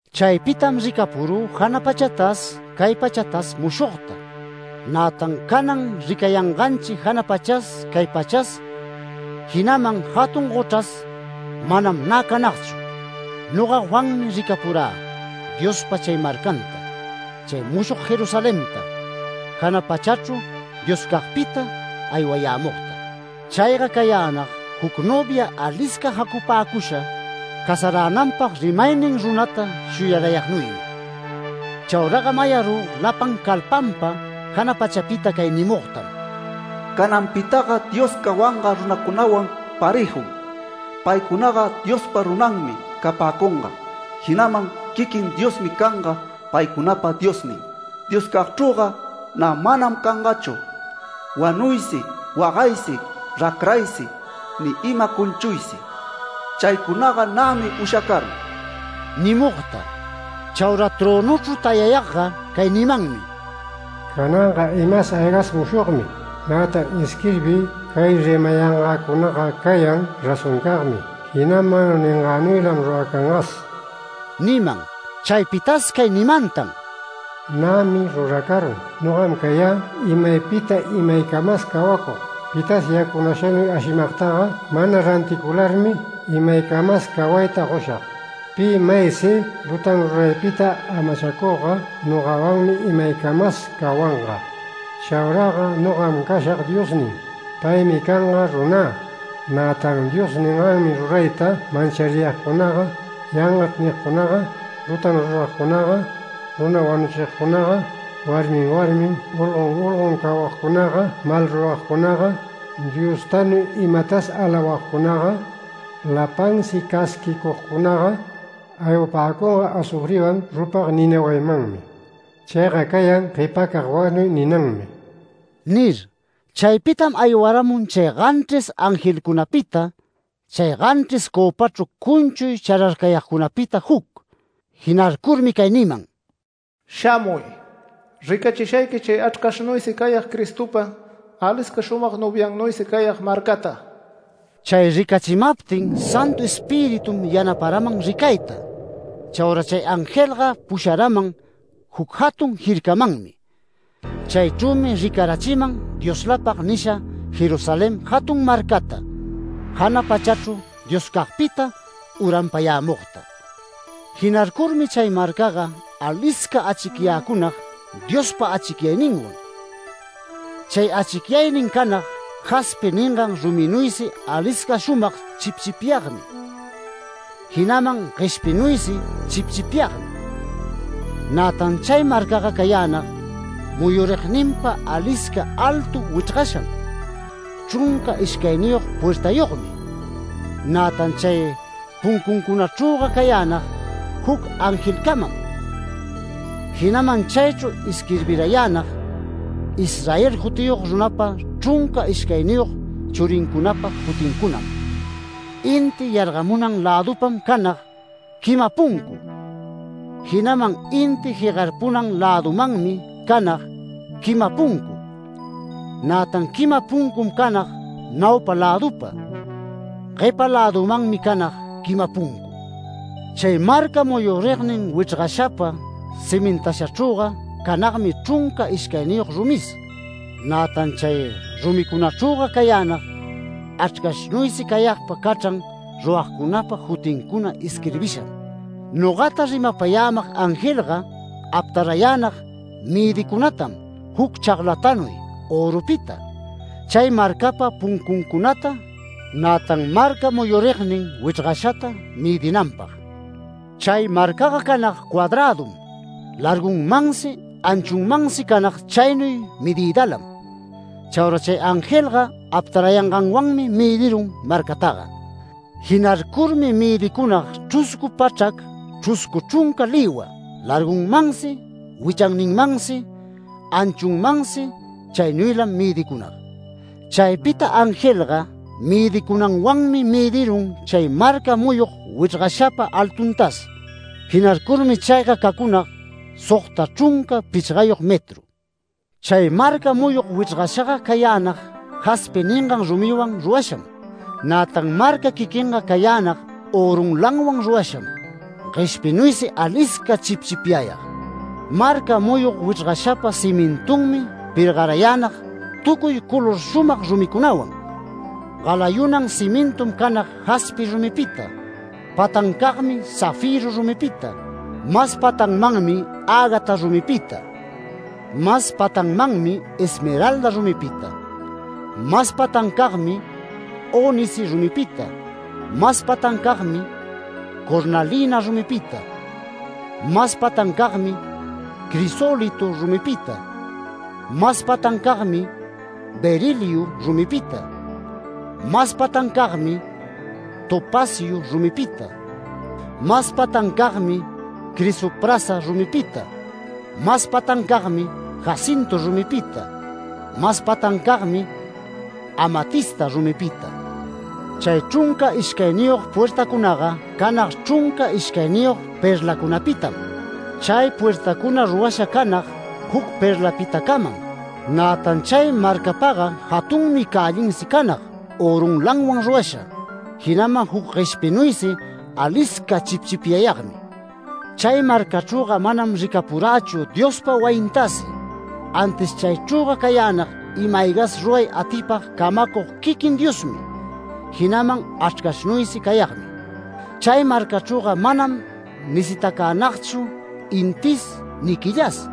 Chaypitam ricapurü jana pachatas cay pachatas mushogta. Nätan canan ricayanganchi jana pachas cay pachas, jinaman jatun gochras manam nä canagchu. Noga Juanmi ricapurä Diospa chay marcanta, chay mushog Jerusalenta, jana pachachru Dioscagpita aywayämugta. Chayga cayänag juc novia alisca jacupäcusha, casaränanpag rimaynin runata shuyarayagnuymi. Chauraga mayarü lapan calpanpa jana pachapita cay nimugtam: “Cananpitaga Dios cawanga runancunawan parëjum. Paycunaga Diospa runanmi capäcunga, jinaman quiquin Diosmi canga paycunapa Diosnin. Dioscagchrüga nä manam cangachu: wanuysi wagaysi racraysi ni ima cunchuysi. Chaycunaga nämi ushacarun” nimugta. Chaura trönuchru tayayagga cay nimanmi: “Cananga imas aygas mushogmi. Nätan isquirbiy, cay rimayangäcunaga cayan razoncagmi, jinaman ningänuylam ruracangas” niman. Chaypitas cay nimantan: “Nämi ruracarun. Nogam cayä imaypita imaycamas cawacug. Pitas yacunashanuy ashimagtaga, mana ranticularmi imaycamas cawayta goshag. Pi maysi lutan ruraypita amachacugga nogawanmi imaycamas cawanga. Chauraga nogam cashag Diosnin, paymi canga runä. Nätan Dios ningannuy rurayta manchariyagcunaga, ‘Yangachr’ nigcunaga, lutalan ruragcunaga, runa wanuchigcunaga, warmin warmin, olgon olgon cawagcunaga, malruragcunaga, Diostanuy imatas alawagcunaga, lapansi casquicugcunaga, aywapäcunga azufriwan rupag nina wayimanmi. Chayga cayan ‘Guepacag wanuy’ ninanmi” nir. Chaypitam aywaramun chay ganchris angelcunapita, chay ganchris cöpachru cunchuy chararcayagpita juc. Jinarcurmi cay niman: “Shamuy, ricachishayqui chay Achrcashnuysi cayag Cristopa alisca shumag noviannuysi cayag marcata”. Chay ricachimaptin Santu Espiritum yanaparaman ricayta. Chaura chay angelga pusharaman juc jatun jircamanmi. Chaychrümi ricarachiman ‘Dioslapag’ nisha Jerusalén jatun marcata, jana pachachru Dioscagpita uranpayämugta. Jinarcurmi chay marcaga alisca achicyäcunag Diospa achicyayninwan. Chay achicyaynin canag jaspi ningan ruminuysi alisca shumag chipchipyagmi, jinaman gueshpinuysi chipchipyagmi. Nätan chay marcaga cayänag muyurigninpa alisca altu wichrgasham, chrunca ishcayniyog puertayogmi. Nätan chay puncuncunachrüga cayänag juc angelcamam. Jinaman chaychru isquirbirayänag Israel jutiyog runapa chrunca ishcayniyog churincunapa jutincunam. Inti yargamunan lädupam canag quima puncu, jinaman inti jegarpunan lädumanmi canag quima puncu, nätan quima puncum canag naupa lädupa, guepa lädumanmi canag quima puncu. Chay marca muyurignin wichrgashapa cimintashachrüga canagmi chrunca ishcayniyog rumis. Nätan chay rumicunachrüga cayänag Achrcashnuysi cayagpa cachran ruragcunapa jutincuna isquirbisham. Nogata rimapayämag angelga aptarayänag mëdicunatam juc chaglatanuy örupita, chay marcapa puncuncunata, nätan marca muyurugnin wichrgashata mëdinanpag. Chay marcaga canag cuadrädum, largunmansi, anchunmansi canag chaynuy medïdalam. Chaura chay angelga aptarayanganwanmi mëdirun marcataga. Jinarcurmi mëdicunag chruscu pachrac chruscu chrunca lïwa, largunmansi wichanninmansi, anchunmansi chaynuylam mëdicunag. Chaypita angelga mëdicunanwanmi mëdirun chay marca muyug wichrgashapa altuntas. Jinarcurmi chayga cacunag sogta chrunca pichgayog metru. Chay marca muyug wichrgashaga cayänag, jaspi ningan rumiwan rurasham. Nätan marca quiquinga cayänag örunlanwan rurasham, gueshpinuysi alisca chipchipyayag. Marca muyug wichrgashapa cimintunmi pergarayänag tucuy color shumag rumicunawan. Galayunan cimintum canag jaspi rumipita, patancagmi zafiru rumipita, mas patanmanmi ágata rumipita, mas patanmanmi esmeralda rumipita, mas patancagmi, ónice rumipita, mas patancagmi cornalina rumipita, mas patancagmi, crisólitu rumipita, mas patancagmi, beriliu rumipita, mas patancagmi, topaciu rumipita, mas patancagmi, crisoprasa rumipita, mas patancagmi, jacintu rumipita, mas patancagmi amatista rumipita. Chay chrunca ishcayniyog puertacunaga canag chrunca ishcayniyog perlacunapitam. Chay puertacuna rurasha canag juc perlapitacamam. Nätan chay marcapaga jatunmi cällinsi canag örunlanwan rurasha, jinaman juc gueshpinuysi alisca chipchipyagmi. Chay marcachrüga manam ricapurächu Diospa wayintasi. Antis chaychrüga cayänag, ima-aygas ruray atipag camacug quiquin Diosmi, jinaman Achrcashnuysi cayagmi. Chay marcachrüga manam necitacänagchu intis ni quillas,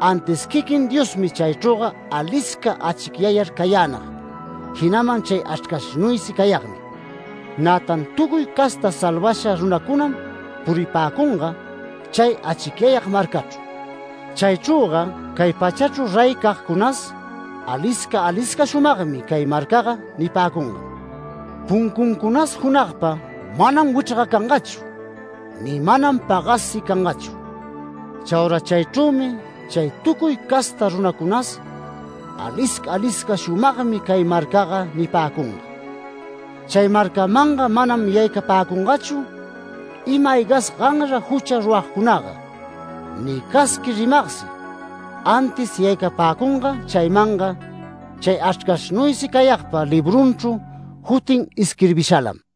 antis quiquin Diosmi chaychrüga alisca achicyayar cayänag, jinaman chay Achrcashnuysi cayagmi. Nätan tucuy casta salvasha runancunam puripäcunga chay achicyayag marcachru. Chaychrüga cay pachachru reycagcunas “Alisca alisca shumagmi cay marcaga” nipäcungam. Puncuncunas junagpa manam wichrgacangachu, ni manam pagassi cangachu. Chaura chaychrümi chay tucuy casta runacunas “Alisca alisca shumagmi cay marcaga” nipäcunga. Chay marcamanga manam yaycapäcungachu, ima-aygas ganra jucha ruragcunaga, ni casqui rimagsi, antis yaycapäcunga chaymanga chay Achrcashnuysi cayagpa librunchru jutin isquirbishalam.